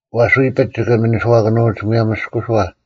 ᐛᔅ ᐎᐱᒡ ᒋᑭ ᒥᓂᔄᑭᓄᐅᒡ ᒧᔭᒻ ᒥᔅᑯᓱᐛ,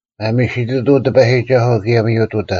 ᒪᒥᓯᑐᑐᐤ ᑎᐸᔨᒋᒐᓱᐤ, ᑭᔭ ᒥᔪᑐᑕ: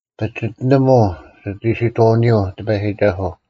ᐸᒋᑎᓂᒧᐤ ᒋᑦ ᐃᓯᑥᐅᓂᔪᐤ ᑎᐸᔨᒋᒐᓱᐤ;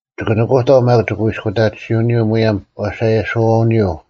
ᒋᑭ ᓄᑯᑕᐤ ᒪᒃ ᒋᑯᐃᔅᑯᑕᑎᓯᐅᓂᔪᐤ ᒧᔭᒻ ᐛᓴᔭᓯᐅᓂᔪᐤ,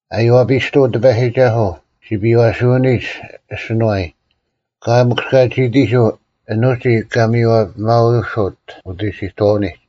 ᐊᔽᐱᔅᑐᐤ ᑎᐸᔨᒋᒐᓱᐤ, ᓯᐱᔪᐛᓯᐅᓂᒡ ᐊᓯᓄᐛᔾ: ᐊᑲᐎᔾ ᒥᑯᔅᑲᒋᐃᑎᓱᐤ ᐊᓐ ᐅᒋ ᑲ ᒥᔽᐱᒪᐅᓯᑦ ᐅᑦ ᐃᓯᑥᐅᓂᒡ,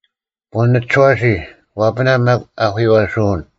ᐳᓂ ᒋᓯᐛᓯ, ᐛᐱᓇ ᒪᒃ ᐊᐧᑯᔪᐛᓱᐅᓐ: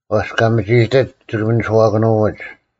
ᐛᔅ ᑲ ᒥᒋᐃᑎᒡ ᒋᑭ ᒥᔄᑭᓄᐛᒡ: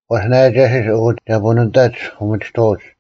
ᐛᔅ ᓇᒐᓯᔅ, ᐊᑯ ᒐ ᐳᓂ ᑕᒡ ᐅᒥᒋᑥᐅᒡ: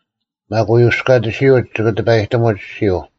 ᒪᒃ ᐅᔪᔅᑲᑎᓯᒡ ᒋᑭ ᑎᐸᔨᑎᒧᒡ ᐊᔅᒋᔪᐤ;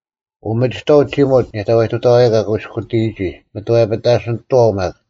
ᐅᒥᒋᑥᐤ ᒋᒧᑦ ᓇᔭᑕᐎᑐᑕᐛᐤ ᑲ ᑯᐃᔅᑯᑎᔨᒋ, ᒪᑥᔭᐱᑕᓯᓂᑐᐛᐤ ᒪᒃ᙮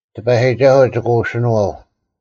ᑎᐸᔨᒋᒐᓱᐤ ᒋᑭ ᐅᓯᓄᐛᐤ;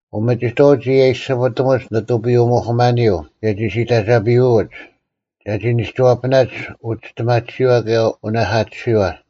ᐅᒥᒋᑥᐅᒡ ᒋ ᔭᔨᔅᒋᐱᑕᒧᒡ ᓂᑐᐱᔪᐅ-ᒧᐧᑯᒪᓂᔪᐤ, ᑭᔭ ᒋ ᓯᑕᒐᐸᐅᒡ, ᒐᒋ ᓂᒋᐛᐱᓇᒡ ᐅᒋᔅᑎᒪᑎᓯᐛ ᑭᔭ ᐅᓇᐧᑲᑎᓯᐛ,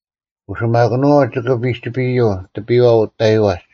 ᐅᓯᒪᑭᓄᐛᐤ ᒋᑭ ᐱᒋᐱᔪᐤ ᑎᐱᔽ ᐅᑕᐃᐛᒡ,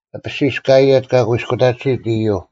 ᐊᐱᓯᔅ ᑲ ᐊᔭᑦ ᑲ ᑯᐃᔅᑯᑕᑎᓯᑦ ᐃᔪᐤ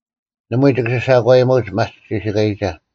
ᓇᒪᐎᔾ ᒋᑭ ᓯᓴᒂᔨᒧᐅᒡ ᒪᒡ ᒋᓯᑲᔨᒐ: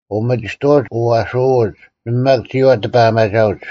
ᐅᒥᒋᑥᐅᒡ ᐅᐛᐊᓱᐅᒡ, ᓇᒪ ᒪᒃ ᒋᐛ ᑎᐸᒪᒐᐅᒡ: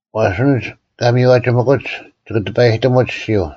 ᐛᔅ ᐊᓐᒡ ᑲ ᒥᔽᒋᒥᑯᒡ ᒋᑭ ᑎᐸᔨᑎᒧᒡ ᐊᔅᒋᔪᐤ;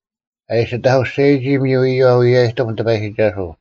ᐊ ᐃᓯ ᑕᑯᔅᒐᔨᒋ ᒥᔪ ᐃᔪᐛ ᐅᔭᔨᑎᒻ ᑎᐸᔨᒋᒐᓱᐤ: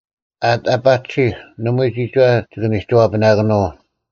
ᐊᑎ ᐊ ᐸᒋᓯᒄ, ᓇᒪᐎᔾ ᒋᒋᐛ ᒋᑭ ᓂᒋᐛᐱᓇᑭᓄᐤ: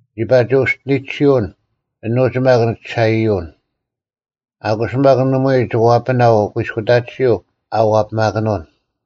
ᓂᒋ ᐸᒋ ᐅᔅᒋᓂᒋᓱᐅᓐ, ᐊᓄᒡ ᒪᒃ ᓂ ᒋᓴᐃᔪᐅᓐ; ᐊᔅᑯ ᒪᒃ ᓇᒪᐎᔾ ᓄᒋ ᐛᐱᒪᐤ ᐅᑯᐃᔅᑯᑕᑎᓯᐤ ᐊ ᐛᐱᓇᑭᓄᐅᑦ,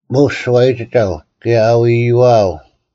ᒧᔅ ᓱᐛᔨᒋᒐᐤ, ᑭᔭ ᐊᐎᐃᐛᐤ;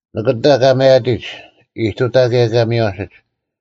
ᓂᑭᑕ ᑲ ᒪᔭᑎᒡ, ᐃᑐᑕ ᑭᔭ ᑲ ᒥᔽᓯᒡ: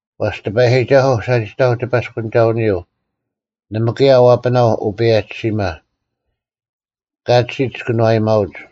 ᐛᔅ ᑎᐸᔨᒋᒐᓱᐤ ᓴᒋᑕᐤ ᑎᐸᔅᑯᓂᒐᐅᓂᔪᐤ, ᓇᒪ ᑭᔭ ᐛᐱᓇᐤ ᐅᐸᔭᒋᓯᒪ; ᑲᒋᒡ ᑭᓄᐛᔨᒪᐅᒡ: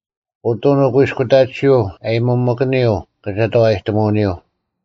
ᐅᑐᓐ ᐅᑯᐃᔅᑯᑕᑎᓯᐤ ᐊᔭᒥᒪᑭᓂᔪᐤ ᑭᒐᑕᐛᔨᑎᒧᐅᓂᔪᐤ,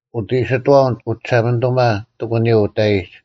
ᐅᑦ ᐃᑎᓱᐛᐅᓐ ᐅᒋᓴᒪᓂᑐᒪ ᑎᒂᓂᔪᐤ ᐅᑕᐃᒡ;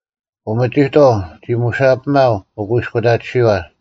ᐅᒥᒋᑥᐤ ᒋᒧᓴᐱᒪᐤ ᐅᑯᐃᔅᑯᑕᑎᓯᐛ,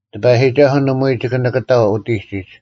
ᑎᐸᔨᒋᒐᓱᐤ ᓇᒪᐎᔾ ᒋᑭ ᓇᑭᑕᐤ ᐅᑎᒋᒡ,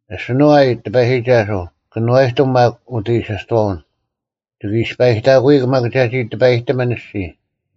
ᐊᓯᓄᐛᔨ ᑎᐸᔨᒋᒐᓱᐤ, ᑭᓄᐛᔨᑎᒻ ᒪᒃ ᐅᑦ ᐃᓯᑥᐅᓐ, ᒋᑭ ᐃᔅᐸᐃᑕᑯᐎᒄ ᒪᒃ ᒐᒋ ᑎᐸᔨᑎᒥᓐ ᐊᔅᒋᔾ: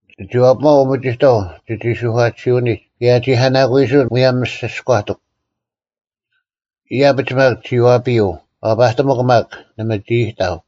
ᓂᒋ ᐛᐱᒪᐤ ᐅᒥᒋᑥᐤ ᒋᒋ ᓱᐧᑲᑎᓯᐅᓂᒡ, ᑭᔭ ᐊ ᒋᑲᓇᑯᐃᓱᑦ ᒧᔭᒻ ᒥᔅᒋᔎᑎᒃ᙮ ᐃᔭᐱᒡ ᒪᒃ ᒋ ᐛᐱᔪᐤ, ᐛᐸᑎᒧᒄ ᒪᒃ, ᓇᒪ ᒋ ᐃᑕᐤ: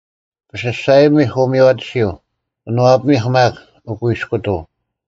ᐱᓯᔅᒐᔨᒥᐧᒄ ᐅᒥᔽᑎᓯᐤ, ᑭᓄᐛᐱᒥᐧᒄ ᒪᒃ ᐅᑯᐃᔅᑯᑐᐤ,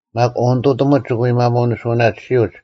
ᒪᒃ ᐅᓂᑐᑎᒧᒡ ᒋᑭ ᒪᒧᐎ ᓂᓱᐅᓇᑎᓯᐅᒡ;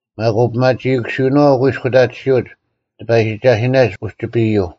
ᒪᒃ ᐅᐱᒪᒋᐃᑯᓯᐅᓄᐛᐤ ᐅᑯᐃᔅᑯᑕᑎᓯᐅᒡ ᑎᐸᔨᒋᒐᓯᓇᒡ ᐅᒋᐱᔪᐤ,